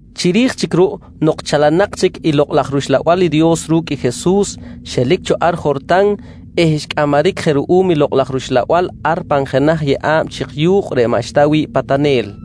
Chiri̱j chic ruꞌ nok chalanak chic i Lokꞌ laj rUxlabal i Dios ru̱cꞌ Jesus, xelic cho ar Jortan eh xcꞌamaric je ruꞌum i Lokꞌ laj Uxlabal ar pan jenaj yeꞌa̱b chik yu̱kꞌ reꞌ maꞌxta wi̱ꞌ patanel.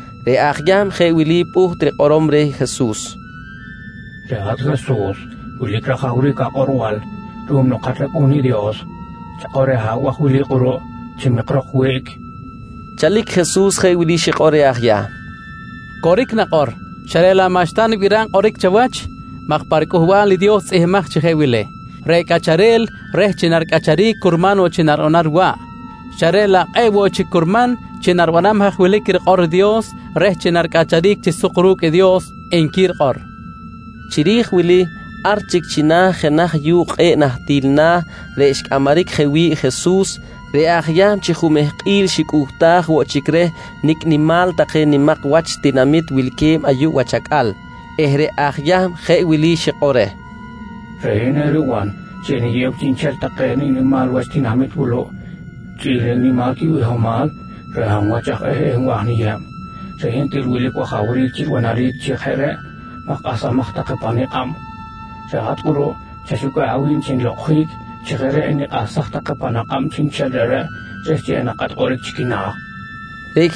Reꞌ aj Yahm jeꞌ wili pꞌuht rikꞌorom reh Jesus: «Reꞌ hat Jesus wilic rajawric akꞌorbal ruꞌum nok hat rAcꞌu̱n i Dios. Chakꞌor reh abaj wili kꞌuruꞌ chi mikrok wiꞌc, nqui reh. Chalic Jesus jeꞌ wili xikꞌor reh aj Yahm: «Coric nakꞌor, xa reꞌ laꞌ maꞌxta nibiram kꞌoric chawach maj pa riCꞌuhbal i Dios tzꞌihmbimaj chi jeꞌ wili: “Reꞌ cꞌacharel reh chi naricꞌacharic curman woꞌ chi naribanam riwaꞌ, xa reꞌ laꞌ kꞌe̱ꞌ woꞌ chic curman chi naribiram haj wilic rikꞌor i Dios reh chi naricꞌacharic chi suk ru̱cꞌ i Dios, nqui rikꞌor, nqui Jesus. Chiri̱j wili ar chic china̱ jenaj yu̱kꞌ kꞌe̱ꞌ nahtil na̱ reꞌ xcꞌamaric je wi̱ꞌ i Jesus, reꞌ aj Yahm chi jumehkꞌil xicꞌuhtaj woꞌ chic reh nicꞌ nimal take nimak wach tinamit wilque̱b ayuꞌ wach acꞌal eh reꞌ aj Yahm jeꞌ wili xikꞌor reh: «Reꞌ hin eriban chi eniyew chiꞌnchel take nimak wach tinamit wuluꞌ chꞌi̱l nicꞌ nimal quibihomal reh hab wach aj eh nwa̱j niyeb. Reꞌ hin til wilic wajawric chi ribanaric chi jeꞌ reꞌ maj kꞌahsamaj take pa nikꞌab. Reꞌ hat kꞌuruꞌ chaxucꞌa̱ꞌ awi̱b chi nilokꞌonjic chi jeꞌ reꞌ enikꞌahsaj take pan akꞌab chiꞌnchel reꞌreꞌ reh chi enakꞌat kꞌoric chi quina̱, nqui reh.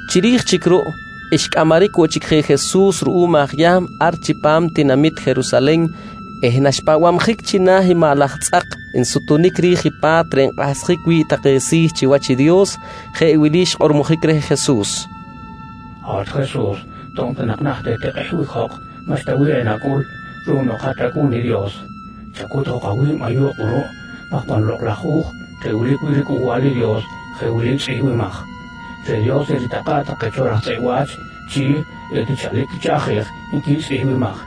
Chiri̱j chic ruꞌ xcꞌamaric woꞌ chic je Jesus ruꞌum aj Yahm ar chipam tinamit Jerusalen eh naxpahbabjic china̱ i maꞌ laj tzꞌak nsutunic ri̱j i pa̱t reꞌ nkꞌahsjic wi̱ꞌ take si̱ chiwach i Dios, jeꞌ wili xkꞌormojic reh Jesus: «Hat Jesus, to̱b ta nak naht etikꞌehbic jok maꞌxta bih enacꞌul ruꞌum nok hat rAcꞌu̱n i Dios. Chacut jok awi̱b ayuꞌ kꞌuruꞌ maj pan Lokꞌ laj Hu̱j reꞌ wilic wi̱ꞌ i riCꞌuhbal i Dios jeꞌ wili tzꞌihmbimaj: “Reꞌ Dios eritakꞌa̱ꞌ take cho raj tzꞌeꞌ wa̱ch chi etichalic quichaꞌjej, nqui tzꞌihmbimaj.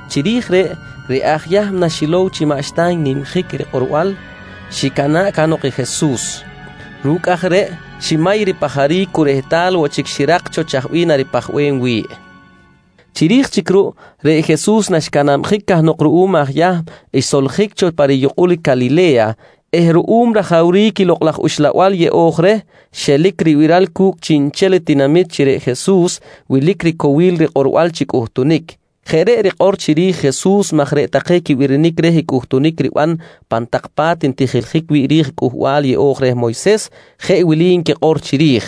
Chiri̱j reꞌ, reꞌ aj Yahm, naxilow chi maꞌxta n-nimjic rikꞌorbal, xicana̱ꞌ cahnok i Jesus. Ru̱cꞌ aj reꞌ, ximay ripajaric cu rehtal woꞌ chic xirak cho chaj bih naripajbem wi̱ꞌ. Chiri̱j chic ruꞌ, reꞌ Jesus, naxcanabjic cahnok ruꞌum aj Yahm, xsoljic cho pa riyukꞌul Calile̱ya eh ruꞌum rajawric i Lokꞌ laj Uxlabal yeꞌo̱j reh, xelic ribiral cu̱cꞌ chiꞌnchel i tinamit chi reꞌ Jesus wilic ricowil rikꞌorbal chi cꞌuhtunic. Jeꞌ reꞌ rikꞌor chiri̱j i Jesus maj reꞌ take quibirinic reh i cꞌuhtunic riban pan tak pa̱t ntijiljic wi̱ꞌ ri̱j i Cꞌuhbal yeꞌo̱j reh i Moyses, jeꞌ wili nquikꞌor chiri̱j: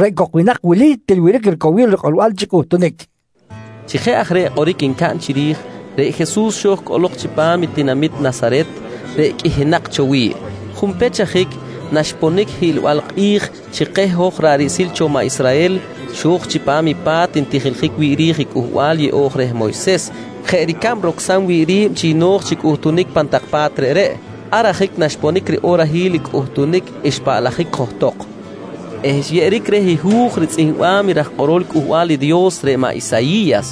«Reꞌ cok i winak wili til wilic ricowil rikꞌorbal chi cꞌuhtunic, nqui nquikꞌor. Chi jeꞌ aj reꞌ kꞌoric ncaꞌn chiri̱j, reꞌ Jesus xo̱j cꞌolok chipam i tinamit Nasaret reꞌ qꞌuihinak cho wi̱ꞌ. Junpech ajic naxponic i hiꞌlbal kꞌi̱j chi keh hoj ra̱ꞌ riꞌsil cho maꞌ Israhel, xo̱j chipam i pa̱t ntijiljic wi̱ꞌ ri̱j i Cꞌuhbal Yeꞌo̱j reh Moyses jeꞌ ricab rocsam wi̱ꞌ ri̱b chi no̱j chi cꞌuhtunic pan tak pa̱t reꞌreꞌ. Ar ajic naxponic riꞌorahil i cꞌuhtunic xpaꞌlajic johtok eh xyeꞌeric reh i hu̱j ritzꞌihmbam i raj kꞌorol Cꞌuhbal i Dios reꞌ maꞌ Isayi̱yas.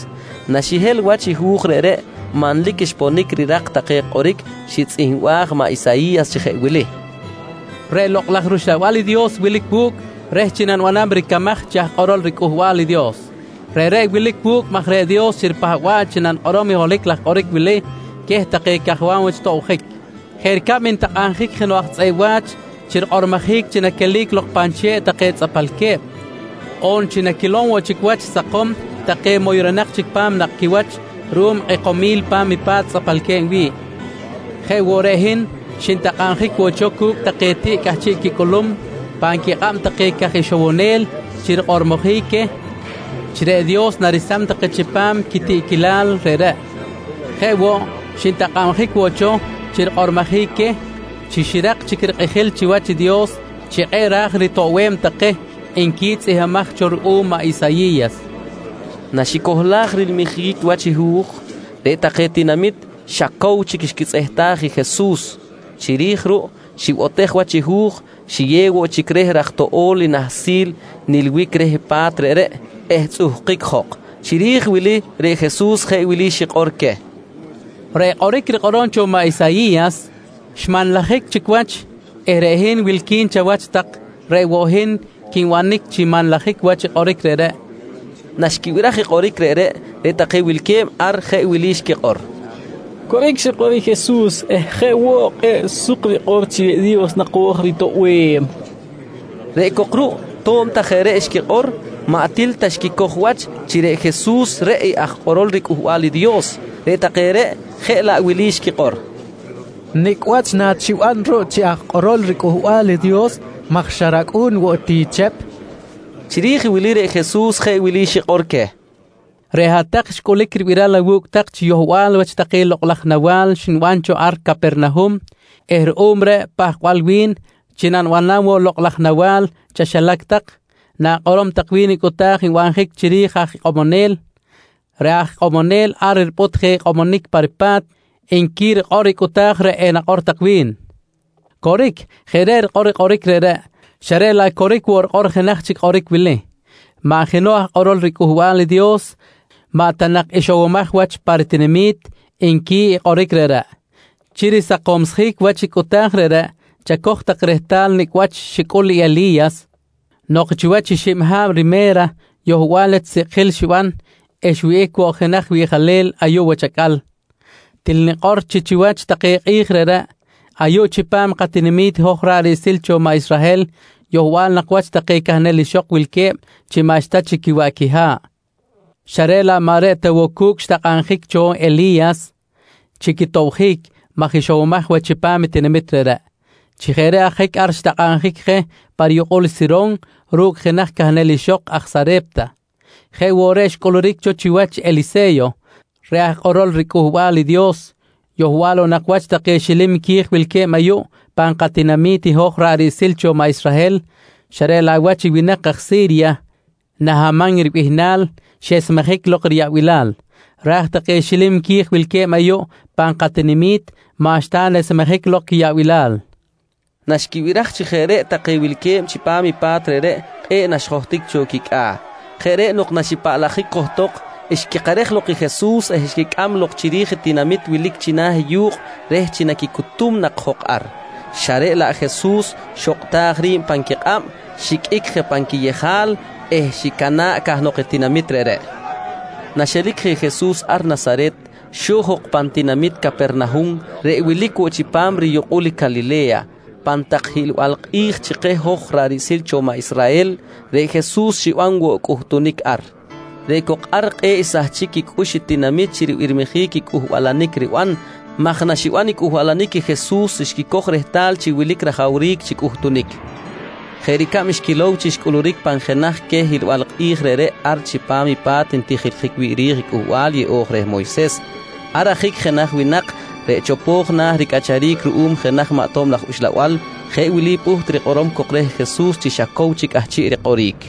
Naxihel wach i hu̱j reꞌreꞌ, manlic xponic rirak take kꞌoric xitzꞌihmbaj maꞌ Isayi̱yas chi jeꞌ wili: “Reꞌ Lokꞌ laj rUxlabal i Dios wilic wu̱cꞌ reh chi nanibanam ricamaj chi aj kꞌorol riCꞌuhbal i Dios. Reꞌreꞌ wilic wu̱cꞌ maj reꞌ Dios xiripahba̱ꞌ chi nanikꞌorom i holohic laj kꞌoric wili queh take cajwam wach tobjic: Jeꞌ ricab ntakꞌabjic jenoꞌ aj tzꞌeꞌ wa̱ch chi rikꞌormojic chi naquelic lok pan che̱ꞌ take tzꞌapalque̱b, on chi naquilom woꞌ chic wach sakom take moyronak chic pa̱m nakꞌ quiwach ruꞌum rikꞌekomil i pa̱t tzꞌapalque̱b wi̱ꞌ, jeꞌ woꞌ reꞌ hin, xintakꞌabjic woꞌ cho cu̱cꞌ take tiꞌ cꞌahchiꞌ quicꞌulum pan quikꞌab take caj ixowonel chi rikꞌormojic queh chi reꞌ Dios naresam take chipam quitiꞌquilal reꞌreꞌ. Jeꞌ woꞌ, xintakꞌabjic woꞌ cho chi rikꞌormojic queh chi xirak chic rikꞌijil chiwach i Dios chi kꞌe̱ꞌ ra̱j ritoꞌbem take, nqui tzꞌihmbimaj cho ruꞌum maꞌ Isayi̱yas. Naxicohlaj rilmijic wach i hu̱j, reꞌ take tinamit xa cow chic xquitzꞌehtaj i Jesus. Chiri̱j ruꞌ, xibotej wach i hu̱j, xiyew woꞌ chic reh raj toꞌo̱l i nahsil nilbic reh pa̱t reꞌreꞌ eh tzꞌuhkic jok. Chiri̱j wili reꞌ Jesus jeꞌ wili xikꞌor queh: «Reꞌ kꞌoric rikꞌorom cho maꞌ Isayi̱yas xmanlajic chic wach eh reꞌ hin wilqui̱n chawach tak reꞌ woꞌ hin quinbanic chi manlajic wach i kꞌoric reꞌreꞌ, nqui Jesus. Naxquibiraj i kꞌoric reꞌreꞌ, reꞌ take wilque̱b ar jeꞌ wili xquikꞌor: «Coric xikꞌor i Jesus eh jeꞌ woꞌ kꞌe̱ꞌ suk rikꞌor chi reꞌ Dios naco̱j ritoꞌbem, nqui xquikꞌor. Reꞌ cok ruꞌ to̱b ta jeꞌ reꞌ xquikꞌor, maꞌ til ta xquicoj wach chi reꞌ Jesus, reꞌ i aj kꞌorol riCꞌuhbal i Dios. Reꞌ take reꞌ, jeꞌ laꞌ wili xquikꞌor: «Nicꞌ wach nachiban ruꞌ chi aj kꞌorol riCꞌuhbal i Dios maj xa racꞌu̱n woꞌ ti Chep? nqui take. Chiri̱j i wili reꞌ Jesus jeꞌ wili xikꞌor queh: «Reꞌ hat-tak xcꞌulic ribiral awu̱cꞌ tak chi yohbal wach take lokꞌ laj nawa̱l xniban cho ar Capernahum eh ruꞌum reꞌ pahkbal wi̱n chi nanibanam woꞌ lokꞌ laj nawa̱l chaxilac tak, na̱kꞌorom tak wi̱n i cꞌuta̱j nbanjic chiri̱j aj ikꞌomonel: “Reꞌ aj ikꞌomonel ar ripꞌut je ikꞌomonic pa ripa̱t, nqui rikꞌor i cꞌuta̱j reꞌ enakꞌor tak wi̱n. «Coric, jeꞌ reꞌ rikꞌor i kꞌoric reꞌreꞌ, xa reꞌ laꞌ coric woꞌ rikꞌor jenaj chic kꞌoric wili: “Maꞌ jenoꞌ aj kꞌorol riCꞌuhbal i Dios maꞌ ta nak ixowomaj wach pa ritinami̱t, nqui i kꞌoric reꞌreꞌ. «Chi risakomsjic wach i cꞌuta̱j reꞌreꞌ, chacoj tak rehtal nicꞌ wach xicꞌul i Eli̱yas nok chiwach i xib ha̱b rime̱ra yohbal wach sikꞌjil xiban eh xwihꞌic woꞌ jenaj wiꞌjalel ayuꞌ wach acꞌal. Til nikꞌor chi chiwach take kꞌi̱j reꞌreꞌ, ayuꞌ chipam i katinami̱t i hoj ra̱ꞌ riꞌsil cho maꞌ Israhel yohbal nak wach take cahnel ixok wilque̱b chi maꞌxta chic quiwaꞌ quiha̱ꞌ, xa reꞌ laꞌ maꞌ reꞌ ta woꞌ cu̱cꞌ xtakꞌabjic cho Eli̱yas chi quitobjic maj ixowomaj wach chipam i tinamit reꞌreꞌ. Chi jeꞌ reꞌ ajic ar xtakꞌabjic je pa riyukꞌul i Siron ru̱cꞌ jenaj cahnel ixok aj Sare̱pta. «Jeꞌ woꞌ reꞌ xcꞌuluric cho chiwach Elise̱yo reꞌ aj kꞌorol riCꞌuhbal i Dios, yohbal woꞌ nak wach take xilim qui̱j wilque̱b ayuꞌ pan katinami̱t i hoj ra̱ꞌ riꞌsil cho maꞌ Israhel, xa reꞌ laꞌ wach i winak aj Si̱rya Nahaman ribihnal xesmejic lok riyaꞌbilal, raj take xilim qui̱j wilque̱b ayuꞌ pan katinami̱t maꞌxta nesmejic lok quiyaꞌbilal, nqui Jesus queh. Naxquibiraj chi jeꞌ reꞌ take wilque̱b chipam pa̱t reꞌreꞌ, kꞌe̱ꞌ naxjohtic cho quicꞌa̱. Jeꞌ reꞌ nok naxipaꞌlajic johtok, xquikerej lok i Jesus eh xquicꞌam lok chiri̱j i tinamit wilic china̱ i yu̱kꞌ reh chi naquicutum nak jok ar, xa reꞌ laꞌ Jesus xokꞌtaj ri̱b pan quikꞌab, xiqꞌuic je pan quiyejal eh xicana̱ꞌ cahnok i tinamit reꞌreꞌ. Naxelic je Jesus ar Nasaret, xo̱j jok pan tinamit Capernahum reꞌ wilic woꞌ chipam riyukꞌul i Calile̱ya. Pan tak hiꞌlbal kꞌi̱j chi keh hoj ra̱ꞌ riꞌsil cho maꞌ Israhel, reꞌ Jesus xiban woꞌ cꞌuhtunic ar. Reꞌ cok ar kꞌe̱ꞌ xsahchic quicꞌux i tinamit chi ribirmijic i cꞌuhbalanic riban maj naxiban cꞌuhbalanic i Jesus xquicoj rehtal chi wilic rajawric chi cꞌuhtunic, jeꞌ ricab xquilow chi xcꞌuluric pan jenaj queh hiꞌlbal kꞌi̱j reꞌreꞌ ar chipam i pa̱t ntijiljic wi̱ꞌ ri̱j i Cꞌuhbal yeꞌo̱j reh i Moyses. Ar ajic jenaj winak reꞌ chopo̱j na̱ ricꞌacharic ruꞌum jenaj maꞌ tob laj uxlabal jeꞌ wili pꞌuht rikꞌorom cok reh Jesus chi xa cow chic cꞌahchiꞌ rikꞌoric: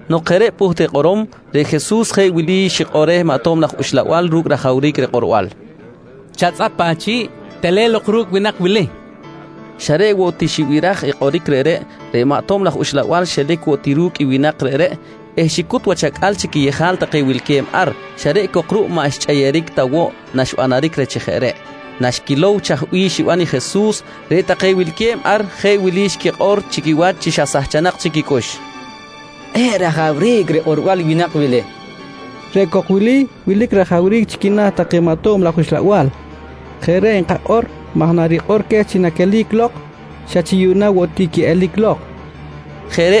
Nok jeꞌ reꞌ pꞌuht rikꞌorom, reꞌ Jesus jeꞌ wili xikꞌor reh maꞌ tob laj uxlabal ru̱cꞌ rajawric rikꞌorbal: «Chatzꞌap achi̱ꞌ. Telen lok ru̱cꞌ winak wili, nqui reh. Xa reꞌ woꞌ ti xibiraj i kꞌoric reꞌreꞌ, reꞌ maꞌ tob laj uxlabal xelic woꞌ ti ru̱cꞌ i winak reꞌreꞌ eh xicut wach acꞌal chi quiyejal take wilque̱b ar, xa reꞌ cok ruꞌ maꞌ xchꞌeyeric ta woꞌ naxbanaric reh chi jeꞌ reꞌ. Naxquilow chaj bih xiban i Jesus, reꞌ take wilque̱b ar jeꞌ wili xquikꞌor chi quiwach chi sahchanak quicꞌux: «Kꞌe̱ꞌ rajawric rikꞌorbal i winak wili. Reꞌ cok wili, wilic rajawric chi quina̱ take maꞌ tob laj uxlabal. Jeꞌ reꞌ nkakꞌor maj narikꞌor queh chi naquelic lok, xa chi yuꞌna woꞌ ti quiꞌelic lok, nqui take.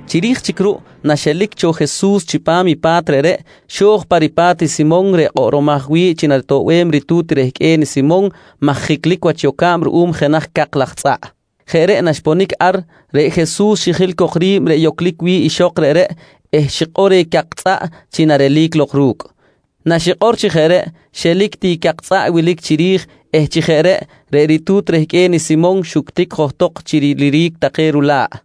Chiri̱j chic ruꞌ na xelic cho Jesus chipam i pa̱t reꞌreꞌ, xo̱j pa ripa̱t i Simon reꞌ kꞌoꞌromaj wi̱ꞌ chi naritoꞌbem ritu̱t rehqꞌue̱n i Simon maj jiclic wach yoca̱b ruꞌum jenaj cak tzꞌaꞌ. Jeꞌ reꞌ naxponic ar, reꞌ Jesus xijil cok ri̱b reꞌ yoclic wi̱ꞌ ixok reꞌreꞌ eh xikꞌor reh cak tzꞌaꞌ chi narelic lok ru̱cꞌ. Naxikꞌor chi jeꞌ reꞌ, xelic ti i cak tzꞌaꞌ wilic chiri̱j eh chi jeꞌ reꞌ, reꞌ ritu̱t rehqꞌue̱n i Simon xuctic johtok chi riliric take rula̱ꞌ.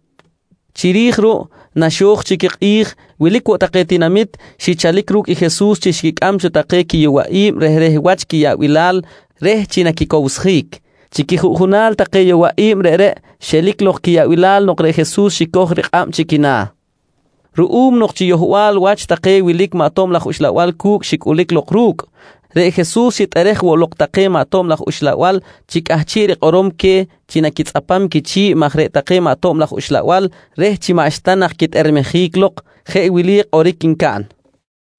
Chiri̱j ruꞌ naxo̱j chic i kꞌi̱j, wilic woꞌ take tinamit xichalic ru̱cꞌ i Jesus chi xquicꞌam cho take yowaꞌi̱b rehreh wach quiyaꞌbilal reh chi naquicowsjic. Chi quijuꞌjunal take yowaꞌi̱b reꞌreꞌ xelic lok quiyaꞌbilal nok reꞌ Jesus xicoj rikꞌab chi quina̱. Ruꞌum nok chi yohbal wach take wilic maꞌ tob laj uxlabal cu̱cꞌ xicꞌulic lok ru̱cꞌ, reꞌ Jesus xitꞌerej woꞌ lok take maꞌ tob laj uxlabal chi cꞌahchiꞌ rikꞌorom queh chi naquitzꞌapam quichi̱ꞌ maj reꞌ take maꞌ tob laj uxlabal reh chi maꞌxta nak quitꞌermejic lok, jeꞌ wili kꞌoric ncaꞌn: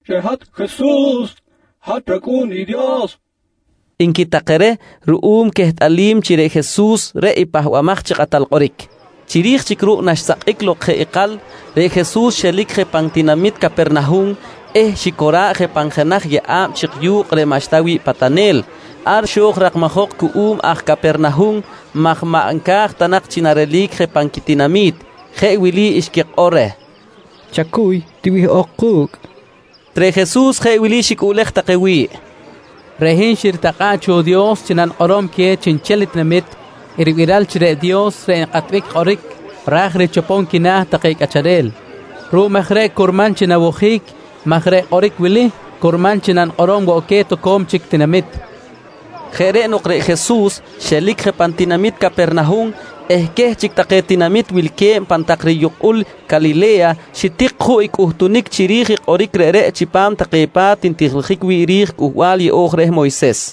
«Reꞌ hat Jesus, hat rAcꞌu̱n i Dios, nqui take reh ruꞌum quehtꞌalim chi reꞌ Jesus reꞌ i Pahbamaj chi Kꞌatal Kꞌoric. Chiri̱j chic ruꞌ naxsakꞌic lok jeꞌ ikal, reꞌ Jesus xelic je pan tinamit Capernahum eh xicora̱ꞌ je pan jenaj yeꞌa̱b chik yu̱kꞌ reꞌ maꞌxta wi̱ꞌ patanel. Ar xo̱j rakmajok cuꞌum aj Capernahum maj maꞌ nca̱j ta nak chi narelic je pan quitinami̱t. Jeꞌ wili xquikꞌor reh: «Chacuy, tiwihꞌok ku̱cꞌ, nqui take reh. Reꞌ Jesus jeꞌ wili xicꞌuꞌlej take wi̱ꞌ: «Reꞌ hin xiritakꞌa̱ꞌ cho i Dios chi nanikꞌorom queh chiꞌnchel tinamit i ribiral chi reꞌ Dios reꞌ nkꞌatbic kꞌoric ra̱j richopom quina̱ take cꞌacharel. Ruꞌum aj reꞌ curman chi nawojic maj reꞌ kꞌoric wili curman chi nanikꞌorom woꞌ queh toco̱m chic tinamit, nqui xikꞌor queh. Jeꞌ reꞌ nok reꞌ Jesus xelic je pan tinamit Capernahum eh queh chic take tinamit wilque̱b pan tak riyukꞌul Calile̱ya xitik juꞌ i cꞌuhtunic chiri̱j i kꞌoric reꞌreꞌ chipam take pa̱t ntijiljic wi̱ꞌ ri̱j Cꞌuhbal Yeꞌo̱j reh Moyses.